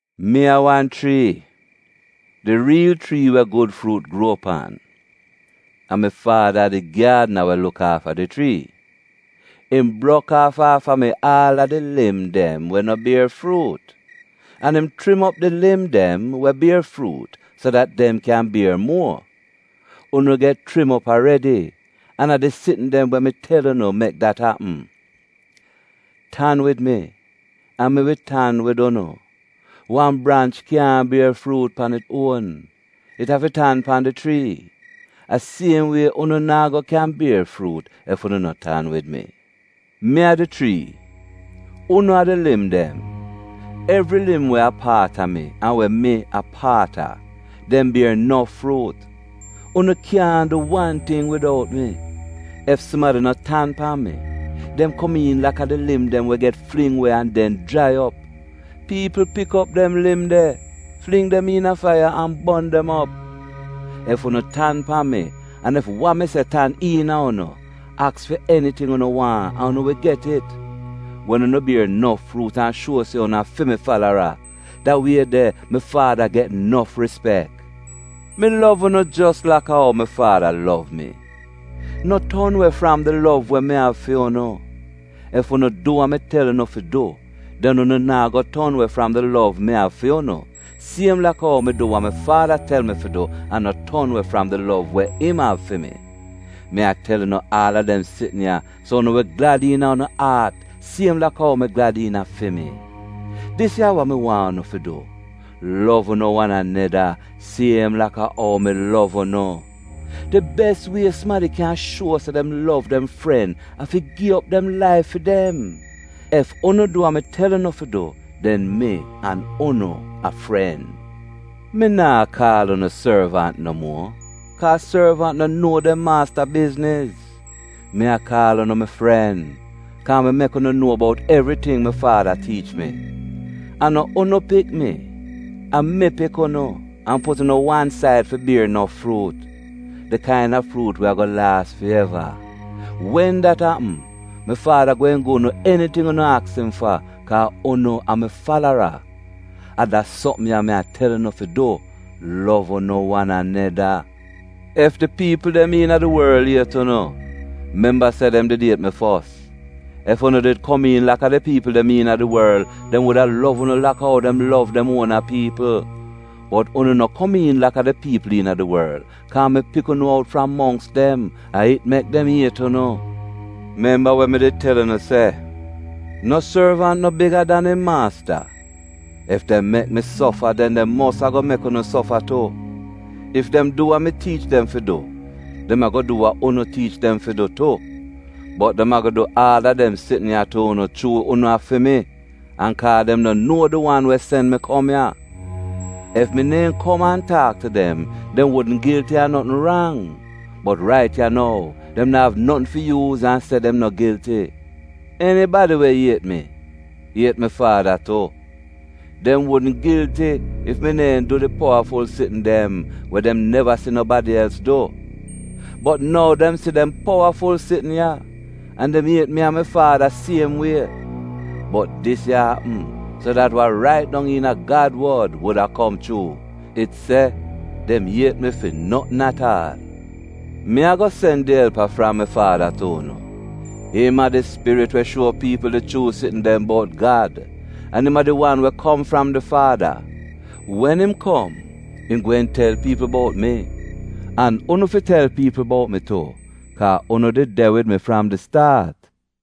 “Mi a wan chrii, di riil chrii we gud fruut gruo pan, an mi Faada a di gyaadna we luk aafa di chrii. Im brok aaf aafa mi aal a di lim dem we no bier fruut. An im chrim op di lim dem we bier fruut so dat dem kyan bier muo. Unu get chrim op aredi, an a di sitn dem we mi tel unu mek dat apm. Tan wid mi, an mi wi tan wid unu. Wan branch kyaahn bier fruut pan it uon; it afi tan pan di chrii. A siem wie unu naa go kyan bier fruut ef unu no tan wid mi. Mi a di chrii; unu a di lim dem. Evri lim we a paat mi — an we mi a paat a — dem bier nof fruut. Unu kyaahn du wan ting widout mi. Ef sumadi no tan pan mi, dem komiin laka di lim dem we get fling we an den jrai op. Piipl pik op dem lim de, fling dem iina faiya an bon dem op. Ef unu tan pan mi an ef wa mi se tan iina unu, aks fi eniting unu waahn, an unu wi get it. Wen unu bier nof fruut an shuo se unu a fi mi falara, da wie de mi Faada get nof rispek. Mi lov unu jos laka ou mi Faada lov mi. No ton we fram di lov we mi av fi unu. Ef unu du wa mi tel unu fi du den unu naa go ton we fram di lov mi av fi unu, siem laka ou mi du wa mi Faada tel mi fi du an no ton we fram di lov we im av fi mi. Mi a tel unu aal a dem sitn ya, so unu wi glad iina unu aat siem laka ou mi glad iina fi mi. Dis ya a wa mi waahn unu fi du: lov unu wan aneda siem laka ou mi lov unu. Di bes wie sumadi kyan shuo se dem lov dem fren a fi gi op dem laif fi dem. Ef unu du wa mi tel unu fi du den mi an unu a fren. Mi naa kaal unu sorvant no muo, kaa sorvant no nuo dem maasta bizniz. Mi a kaal unu mi fren, kaa mi mek unu nuo bout evriting mi Faada tiich mi. A no unu pik mi, a mi pik unu an put unu wan said fi bier nof fruut — di kaina fruut we ago laas fi eva. Wen dat apm, mi Faada gweehn gu'unu eniting unu aks im fa kaa unu a mi falara. A da sopm ya mi a tel unu fi du: lov unu wan aneda. “Ef di piipl dem iina di worl iet unu, memba se dem did iet mi fos. Ef unu did komiin laka di piipl dem iina di worl, dem wuda lov unu laka ou dem lov dem uona piipl. Bot unu no komiin laka di piipl iina di worl, kaa mi pik unu out fram mongks dem. A it mek dem iet unu. Memba we mi did tel unu se, ‘No sorvant no biga dan im maasta.’ Ef dem mek mi sofa den dem mos ago mek unu sofa tu. Ef dem du wa mi tiich dem fi du, dem ago du wa unu tiich dem fi du tu. Bot dem ago du aal a dem sitn ya tu unu chuu unu a fi mi, an kaa dem no nuo di wan we sen mi kom ya. Ef mi neehn kom an taak tu dem, dem wudn gilti a notn rang. Bot rait ya nou, dem na'av notn fi yuuz an se dem no gilti. Enibadi we iet mi, iet mi Faada tu. Dem wudn gilti ef mi neehn du di powaful sitn dem we dem neva si nobadi els du. Bot nou dem si dem powaful sitn ya, an dem iet mi an mi Faada siem wie. Bot dis ya apm so dat wa rait dong iina Gad wod wuda kom chuu. It se, ‘Dem iet mi fi notn at aal.’ “Mi ago sen di Elpa fram di Faada tu unu. Im a di Spirit we shuo piipl di chuu sitn dem bout Gad, an im a di wan we kom fram di Faada. Wen im kom, im gweehn tel piipl bout mi. An unu fi tel piipl bout mi tu, kaa unu did de wid mi fram di staat.